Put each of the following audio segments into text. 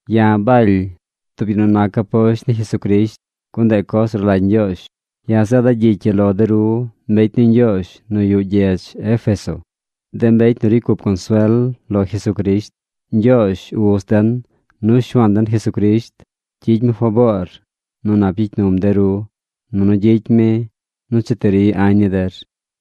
Ya̱ Baly, tub yu nu nac aposht ni Jesucrisht, gun ndeꞌ coz nu rlagy Ñgyoozh. Ya̱ zeeda̱ gyicy ii lo de ru mbecy ni Ñgyoozh nu yuꞌ gyedz Éfeso, de mbecy nu ricy cup consuel lo Jesucrisht. Ñgyoozh, Uz den, nu Shuaan den Jesucrisht gyicy mi faboor nu nap gyicy num de ru, nunu gyicy mi nu cheti ri añ ni der.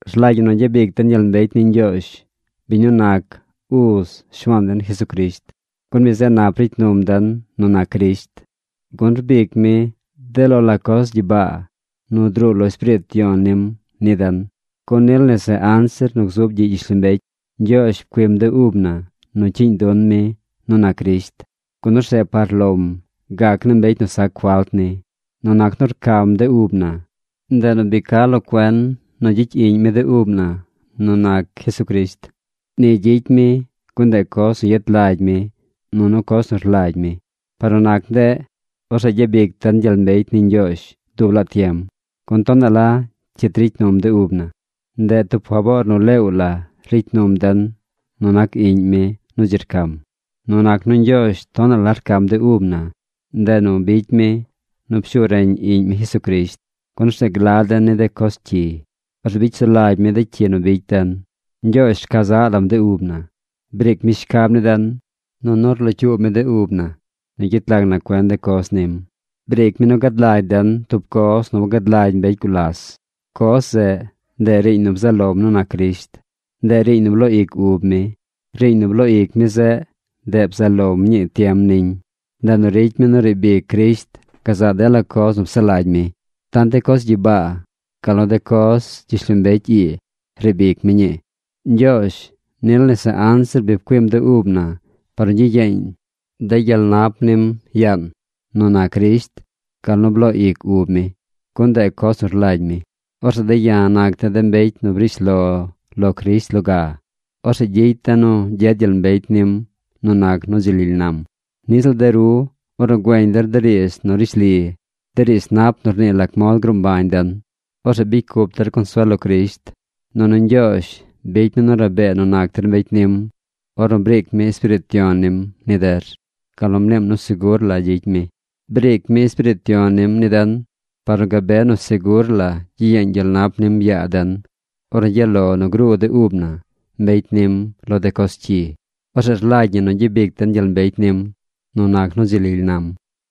Rlagy ñi nu gyabic den gyel mbecy ni Ñgyoozh, biñ nu nac uz Shuaan den Jesucrisht, gun mi zeꞌ nap ricy num den nu nac Crisht, gun rbic mi de lo la coz gyibaa nu druu lo Espiriit Yon nim ni den. Gun nil nese anzir nu gzub gyiꞌ gyishlombecy, Ñgyoozh pcuim de ub na nu cyiiñ dun mi nu nac Crisht, gun orzeꞌ par lom gac naa mbecy nu sac falt ni. Nu nac nu rcam de ub na, ndeꞌ nu bi ca lo cuen nu gyicy iꞌñ mi de ub na nu nac Jesucrisht. Ni gyicy mi gun ndeꞌ coz nu yet lagy mi nunu coz nu rlagy mi. Par nu nac ndeꞌ, orzeꞌ gyabic den gyel mbecy ni Ñgyoozh dub laa tiem, gun tonaꞌ la cyit ricy num de ub na. Ndeꞌ tub faboor nu leew la ricy num den nu nac Iꞌñ mi nu dzi rcam. Nu nac nu Ñgyoozh tonaꞌ la rcam de ub na, ndeꞌ nu bicy mi nu pshu reñ Iꞌñ mi Jesucrisht, gun orzeꞌ gla den ni de coz cyi. Orzeꞌ bicy sulagy mi de cyi nu bicy den. Ñgyoozh rca zaꞌ lam de ub na. Briic mi shcab ni den, nunu rlocyuub mi de ub na nu gyet lag na cuen de coz nim. Briic mi nu gad lagy den tub coz nu wangad lagy mbecy gulas. Coz zeꞌ, ndeꞌ riiñ nu bzaꞌ lom nu nac Crisht. Ndeꞌ riiñ nu bloo ic ub mi. Riiñ nu bloo ic mi zeꞌ, ndeꞌ bzaꞌ lom ñii tiem niñ. Ndeꞌ nu ricy mi nu riib ic Crisht gazaꞌ dela coz nu psaꞌ lagy mi. Tant de coz gyibaa, gal nu de coz gyishlombecy ii riib ic mi ñii. Ñgyoozh nil nese anzir bi pcuim de ub na par nu gyiyeeñ de gyel nap nim yaan nu nac Crisht gal nu bloo ic ub mi, gun ndeꞌ coz nu rlagy mi. Orzeꞌ de̱ ya̱ nac de̱ de mbecy nu brish lo lo Crisht loga. Orzeꞌ gyicy de̱ nu gyed gyel mbecy nim nu nac nu dzi lily nam. Niꞌ ziꞌl de ru, ornu güeñ der de riidz nu rishli, de riidz nap nu rnii lac mod gruu mbañ den, orzeꞌ bicy cup der consuel lo Crisht, nunu Ñgyoozh bicy mi nu rabee nu nac der mbecy nim ornu briic mi Espiriit Yon nim ni der, gal nu mniim nu segur la gyicy mi. Briic mi Espiriit Yon nim ni den par nu gabe nu segur la gyiyeeñ gyel nap nim yaa den ornu gyaꞌ lo nu gruu de ub na, mbecy nim, lo de coz cyi. Orzeꞌ rlagy ñi nu gyabic den gyel mbecy nim nu nac nu dzi lily nam.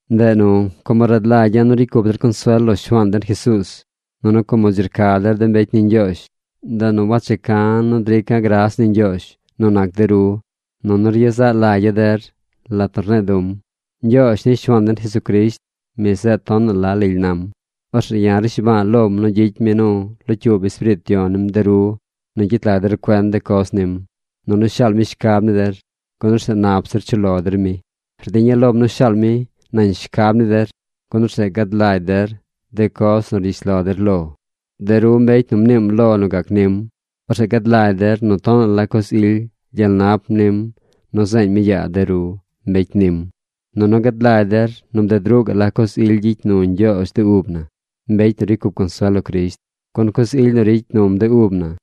Ndeꞌ nu, como rad lagya̱ nu ricy cup der consuel lo Shuaan den Jesuuz, nunu como dzi rca der de mbecy ni Ñgyoozh, ndeꞌ nu wacheca̱ nu drica̱ gras ni Ñgyoozh nu nac de ru, nunu ryezaꞌ lagya̱ der lat nu rne̱e̱ du̱m. Ñgyoozh ni Shuaan den Jesucrisht, mi zeꞌ tonaꞌ la lily nam. Orzeꞌ ya̱ rnishba̱a̱ lom nu gyicy mi nu locyuub Espiriit Yon nim de ru nu gyet lag der cuen de coz nim, nunu shaal mi shcab ni der, gun orzeꞌ nap zir chuꞌ lo der mi. Rdiña̱ lom nu shaal mi nañ shcab ni der, gun orzeꞌ gad lagy der de coz nu rgyish lo der lo. De ru mbecy nu mniim lo nu gac nim. Orzeꞌ gad lagy der nu tonaꞌ la coz ily gyel nap nim nu zeeñ mi yaa de ru, mbecy nim. Nunu gad lagy der nu bded ruꞌ gaꞌ la coz ily gyicy nu Ñgyoozh de ub na, mbecy nu ricy cup consuel lo Crisht. Gun coz ily nu ricy num de ub na,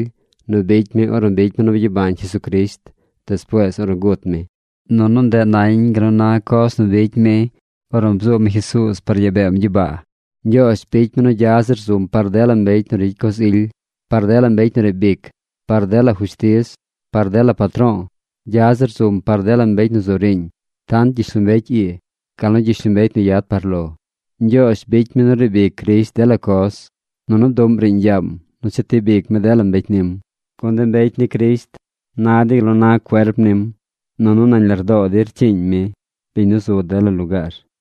nu bicy mi ornu bicy mi nu byabañ Jesucrisht despuees ornu gut mi, nunu ndeꞌ nañ gal nu na coz nu bicy mi ornu bzuub mi Jesuuz par yaa beem gyibaa. Ñgyoozh bicy mi nu gya zir zum par dela mbecy nu ricy coz ily, par dela mbecy nu riib ic, par dela fushtiz, par dela patro̱o̱. Gya zir zum par dela mbecy nu zu riiñ: tant gyishlombecy ii, gal nu gyishlombecy nu yad par lo. Ñgyoozh bicy mi nu riib ic Crisht dela coz, nunu bduꞌm riiñ yaam nu chetib ic mi dela mbecy nim. Gun de mbecy ni Crisht na dey gal nu na cuerp nim. Nunu nañ lardoo dey rcyiiñ mi, biñ nu zu dela lugaar.